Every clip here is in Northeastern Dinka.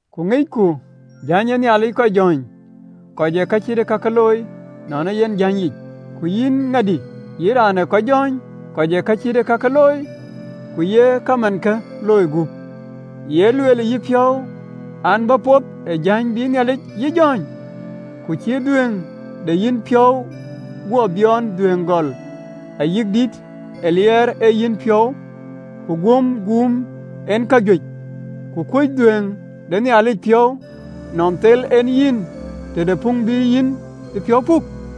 Ku aŋicku jäny ee Nhialic kɔc jɔ̈ɔ̈ny, kɔc ë ka cït ee kakë looi, nɔn ee yen jäny yic. Ku yïn ŋadï, yïn raan ee kɔc jɔ̈ɔ̈ny, kɔc ë ka cït ee kakë looi, ku ye kamankë looi gup, ye lueel ë yïpiɔ̈u, an, bä poth ë jäny bï Nhialic yï jɔ̈ɔ̈ny? Ku cï dhuëëŋ de yepiɔ̈u guɔ biɔɔn dhuëëŋ gök, ayï dït ë liɛɛr ë yenpiɔ̈u, ku guöm guum en kajuëc, ku kuc dhuëëŋ de Nhialic piɔ̈u nɔn thel en yïn tëde puŋ bï yïn yïpiɔ̈u puk?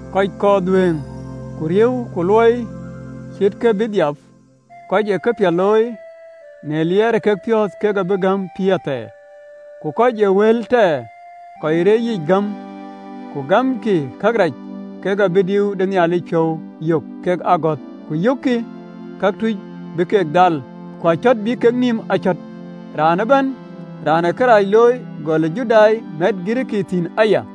Kɔc kɔɔr dhuëëŋ ku riëëu ku luɔi cïï kek bï dhiap, kɔc ë këpiɛth looi në liɛɛr ë kepiɔ̈ɔ̈th, kek abï gäm pïïr thɛɛr. Ku kɔc ë wël tɛɛr, kɔc reec yic gam, ku gamkï kërac, kek abï diu de Nhialic piɔ̈u yök kekë agɔ̈th. Ku yökkï këtuc bï keek dhal ku acɔ̈t bï kek nïïm acɔ̈t, raan ëbɛ̈n raan ë kërac looi, gɔl ë Judai, mɛt Girikii thïn aya.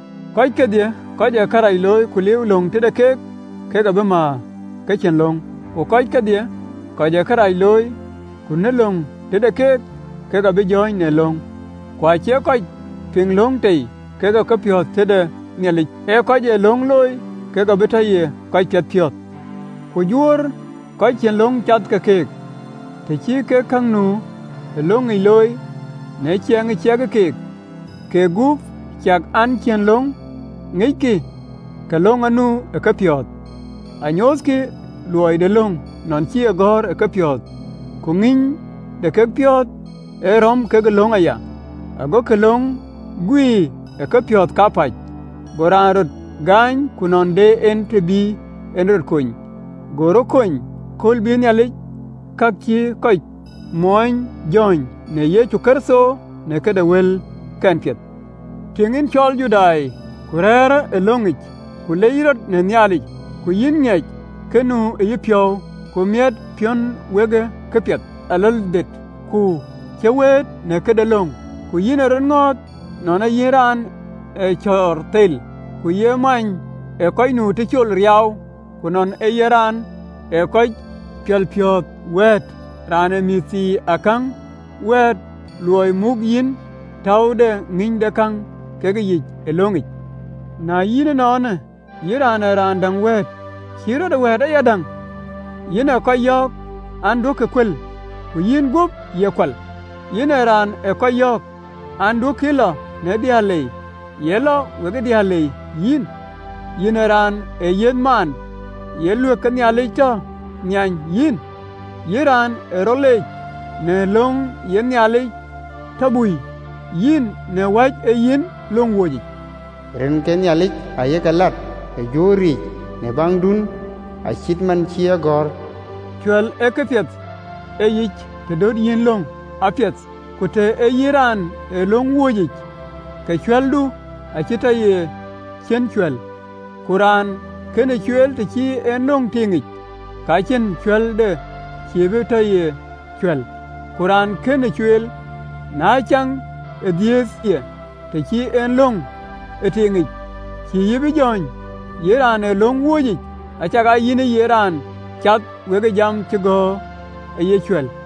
Kɔc kedhie kɔc ë kërac looi ku liu löŋ tëde keek, kek abï määr ke cïn löŋ, ku kɔc kedhie kɔc ë kërac looi, ku nu löŋ tëde keek, kek abï jɔ̈ɔ̈ny në löŋ. Ku acie kɔc piŋ löŋ tei, kek ee kɔc piɛthpiɔ̈ɔ̈th tëde Nhialic, ee kɔc ë löŋ looi, kek abï tɔ ye kɔc piɛthpiɔ̈ɔ̈th. Ku Juöör, kɔc cïn löŋ cath ke keek, të cï kek ka nu ë löŋic looi, në ciɛɛŋ ë ciɛkë keek, keek gup, ciɛk an, cïn löŋ ŋickï, ke löŋ anu ë kepiɔ̈ɔ̈th. Anyoothkï luɔi de löŋ nɔn cï e gɔ̈ɔ̈r ë kepiɔ̈ɔ̈th, ku ŋïny de kepiɔ̈ɔ̈th ee rɔ̈m kekë löŋ aya, agokï löŋ guiir ë kepiɔ̈ɔ̈th kapäc, go raan rɔt gaany, ku nɔn de en të bï en rɔt kony, go rɔt kony. Kööl bï Nhialic ka cïï kɔc moony jɔ̈ɔ̈ny në Yecu Kërtho, në këde wëlkiën piɛth. Tïŋ, yïn cɔl Judai, ku rɛ̈ɛ̈rë ë löŋic, ku lec rɔt në Nhialic, ku yïn ŋic kë nu ë yepiɔ̈u, ku mitëpiɔ̈u wekë kapiɛth aläldïïtë, ku cï wëët në këde löŋ, ku yïn ë rɔt ŋɔ̈ɔ̈th nɔn ee yïn raan ee cɔɔr thel, ku ye many ee kɔc nu tëcol riaau, ku nɔn ee yïn raan ee kɔc piɔlpiɔ̈ɔ̈th wɛ̈ɛ̈t, raan ë mɛnhiinakäŋ wɛ̈ɛ̈t, luɔi yïn täu de ŋïnydekäŋ kekë yic ë löŋic, na yïn ënɔɔnë, yïn ë raan däŋ wɛ̈ɛ̈t, cïï rɔt ë wɛ̈ɛ̈t ayadäŋ? Yïn ee kɔc yɔ̈ɔ̈k an, “Duökï ë kual”, ku yïn guöp, ye kual? Yïn raan ee kɔc yɔ̈ɔ̈k an, “Duökï ë lɔ në diëër lei”, ye lɔ we diëër lei yïn? Yïn raan ë yiëth maan, ye luëk ke Nhialic tɔ nhiany yïn? Yïn raan ë rɔt leec në löŋ, ye Nhialic tɔ bui, yïn, në wäc ee yïn löŋ wööcic? (LXX). Rin ke Nhialic aye ke läät ë Juööriic në baŋdun, acït man cï e gɔ̈ɔ̈r. Cuɛ̈l ee këpiɛth ë yic, të döt yïn löŋ apiɛth, ku të ee yïn raan ë löŋ wööcic, ke cuɛ̈ldu acï tɔ ye ciën cuɛ̈l. Ku raan kënë cueel, të cï en löŋ tiiŋic, ke ciën cuɛ̈lde cïï bï tɔ ye cuɛ̈l? Ku raan kënë cueel, në caŋ ë dhiëëthë ye, të cï en löŋ aa tiiŋic, cïï yï bï jɔ̈ɔ̈ny, yïn raan ë löŋ wööcic, acakaa yïn ëye raan cath we jam cï gɔ̈ɔ̈r ayï cuɛ̈l?